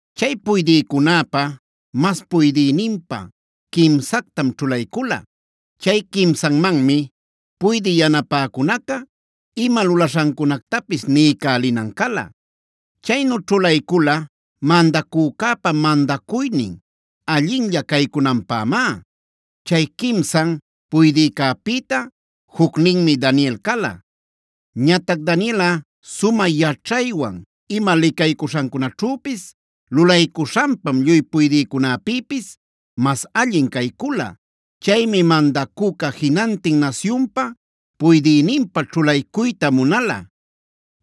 Chay puydïcunäpa mas puydïninpä quimsactam ćhulaycula. Cay quimsanmanmi puydï yanapäcunaca ima lulaśhancunactapis niycälinan cala. Chaynu ćhulaycula mandacücäpa mandacuynin allinlla caycunanpämá. Chay quimsan puydïcäpïta jucninmi Daniel cala. Ñatac Danielꞌa sumä yaćhaywan ima licaycuśhancunaćhüpis lulaycuśhanpam lluy puydïcunäpïpis mas allin caycula. Chaymi mandacüca jinantin nasyunpa puydïninpä ćhulaycuyta munala.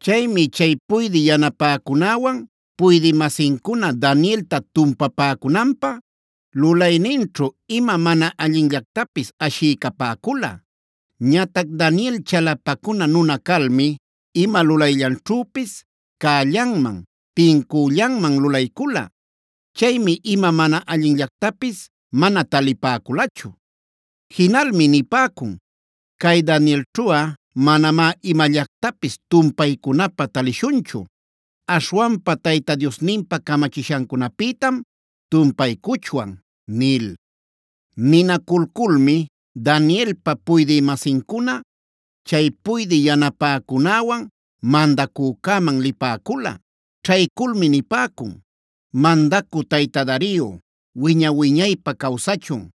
Chaymi chay puydï yanapäcunäwan puydï-masincuna Danielta tumpapäcunanpä lulayninćhu ima mana allinllactapis ashiycapäcula. Ñatac Daniel chalapacuna nuna calmi ima lulayllanćhüpis cällanman, tincüllanman lulaycula. Chaymi ima mana allinllactapis mana talipäculachu. Jinalmi nipäcun: “Cay Danielćhuꞌa manamá imallatacpis tumpaycunapä talishunchu. Aśhwanpa Tayta Diosninpa camachishancunapïtam tumpaycuchwan” nil. Ninaculculmi Danielpa puydï-masincuna, chay puydï yanapäcunäwan mandacücäman lipäcula. Ćhayculmi nipäcun: “¡Mandacü tayta Dario, wiña-wiñaypä cawsachun!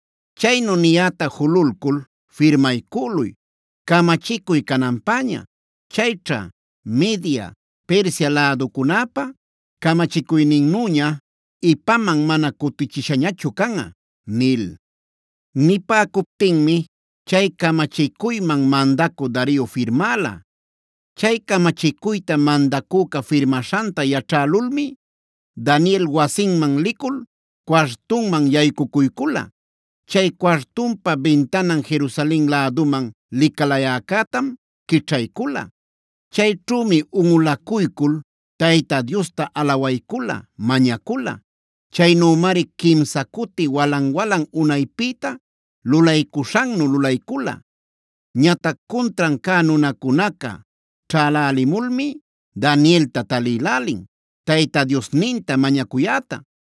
Chaynu niyäta jululcul firmaycüluy camachicuy cananpäña. Chayćha Media, Persia läducunäpa camachicuyninnüña ipaman mana cutichishañachu canꞌa” nil. Nipäcuptinmi chay camachicuyman mandacü Dario firmäla. Chay camachicuyta mandacüca firmaśhanta yaćhälulmi Daniel wasinman licul cuartunman yaycucuycula. Chay cuartunpa bintanan Jerusalen läduman licalayäcätam quićhaycula. Chayćhümi unꞌulacuycul Tayta Diosta alawaycula, mañacula. Chaynümari quimsa cuti walan-walan unaypïta lulaycuśhannu lulaycula. Ñatac cuntran cä nunacunaca ćhälälimulmi Danielta talïlälin, Tayta Diosninta mañacuyäta.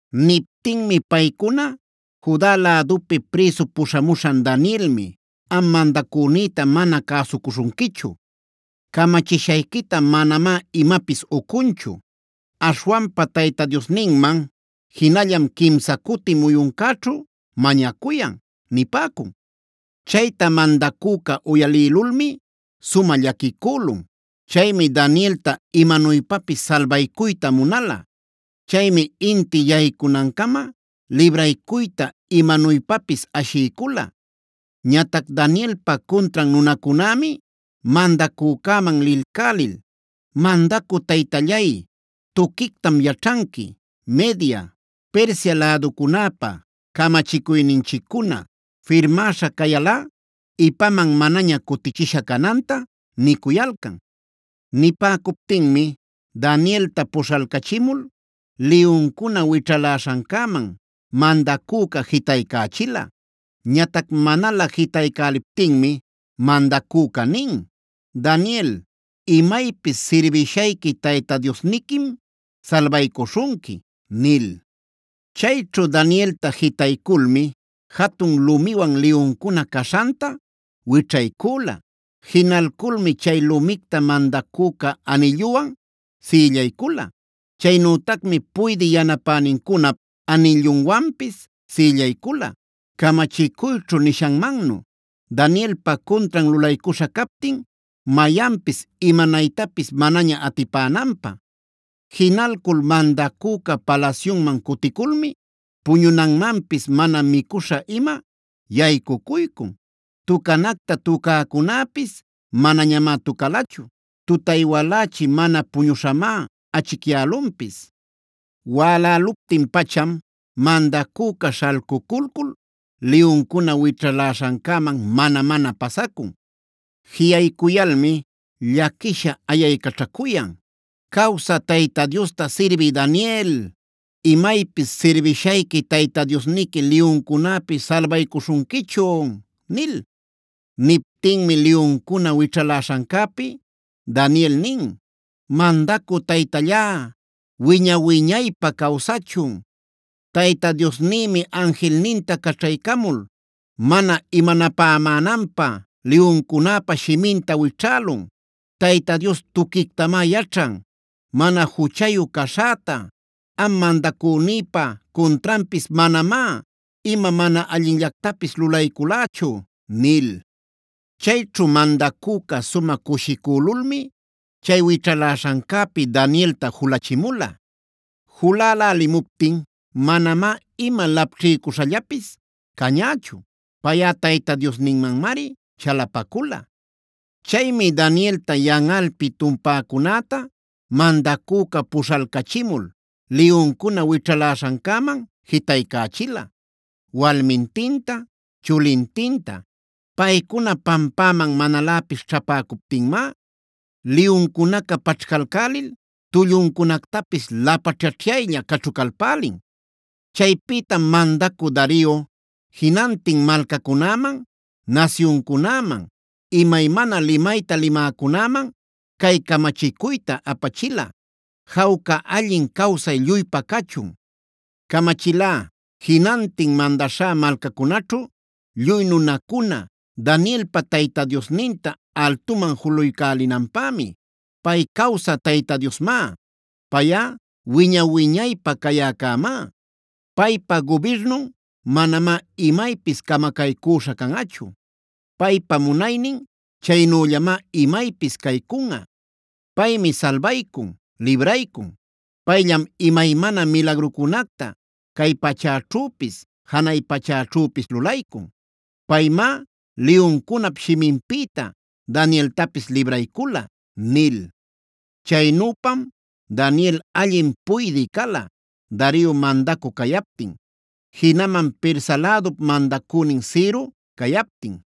Niptinmi paycuna: “Juda lädupi prïsu puśhamuśhan Danielmi am mandacünïta mana cäsucuśhunquichu; camachishayquita manamá imapis ucunchu. Aśhwanpa Tayta Diosninman jinallam quimsa cuti muyuncäćhu mañacuyan” nipäcun. Chayta mandacüca uyalïlulmi sumä llaquicülun. Chaymi Danielta imanuypapis salbaycuyta munala. Chaymi inti yaycunancama libraycuyta imanuypapis ashiycula. Ñatac Danielpa cuntran nunacunämi mandacücäman lilcälil: “Mandacü taytallay, tuquictam yaćhanqui Media, Persia läducunäpa camachicuyninchiccuna firmäśha cayalꞌa ipaman manaña cutichisha cananta” nicuyalcan. Nipäcuptinmi Danielta puśhalcachimul liyuncuna wićhaläśhancäman mandacüca jitaycächila. Ñatac manalä jitaycäliptinmi mandacüca nin: “Daniel, imaypis sirbishayqui Tayta Diosniquim salbaycuśhunqui” nil. Chayćhu Danielta jitayculmi jatun lumiwan liyuncuna caśhanta wićhaycüla. Jinalculmi chay lumicta mandacüca anilluwan sïllaycula. Chaynütacmi puydï yanapänincunap anillunwanpis sïllaycula camachicuyćhu nishanmannu Danielpa cuntran lulaycuśha captin, mayanpis imanaytapis manaña atipänanpä. Jinalcul mandacüca palasyunman cuticulmi puñunanmanpis mana micuśha-ima yaycucuycun. Tucanacta tucäcunäpis manañamá tucalachu. Tutay walächi mana puñuśhamá achicyälunpis. Wäläluptin-pacham mandacüca śhalcuculcul liyuncuna wićhaläśhancäman mana-mana pasacun. Jiꞌaycuyalmi llaquisha ayaycaćhacuyan: “Cawsä Tayta Diosta sirbï Daniel, ¿imaypis sirbishayqui Tayta Diosniqui liyuncunäpi salbaycuśhunquichun?” nil. Niptinmi liyuncuna wićhaläśhancäpi Daniel nin: “¡Mandacü taytallá, wiña-wiñaypä cawsachun! Tayta Diosnïmi anjilninta caćhaycamul mana imanapämänanpä liyuncunäpa shiminta wićhälun. Tayta Dios tuquictamá yaćhan mana juchayu caśhäta. Am mandacünïpa cuntranpis manamá ima mana allinllactapis lulayculächu” nil. Chayćhu mandacüca sumä cushicülulmi chay wićhaläśhancäpi Danielta julachimula. Julälälimuptin manamá ima lapćhiycuśhallapis cañächu. Payꞌa Tayta Diosninmanmari chalapacula. Chaymi Danielta yanꞌalpi tumpäcunäta mandacüca puśhalcachimul liyuncuna wićhaläśhancäman jitaycächila walmintinta, chulintinta. Paycuna pampäman manaläpis ćhäpäcuptinmá liyuncunaca paćhcalcälil tulluncunactapis lapaćhaćhyaylla caćhucalpälin. Chaypïtam mandacü Dario jinantin malcacunäman, nasyuncunäman, imaymana limayta limäcunäman cay camachicuyta apachila: “¡Jawca allin cawsay lluypa cachun! Camachilá jinantin mandaśhá malcacunaćhu lluy nunacuna, Danielpa Tayta Diosninta altuman julaycälinanpämi. “Pay cawsä Tayta Diosmá. Payꞌa wiña-wiñaypä cayäcämá Paypa gubirnun manamá imaypis camacaycüśha canꞌachu. Paypa munaynin chaynüllamá imaypis caycunꞌa. Paymi salbaycun, libraycun. Payllam imaymana milagrucunacta cay pachäćhüpis, janay pachäćhüpis lulaycun. Paymá liyuncunap shiminpïta Danieltapis libraycula” nil. Chaynüpam Daniel allin puydï cala Dario mandacü cayaptin, jinaman Persa lädup mandacünin Ciro cayaptin.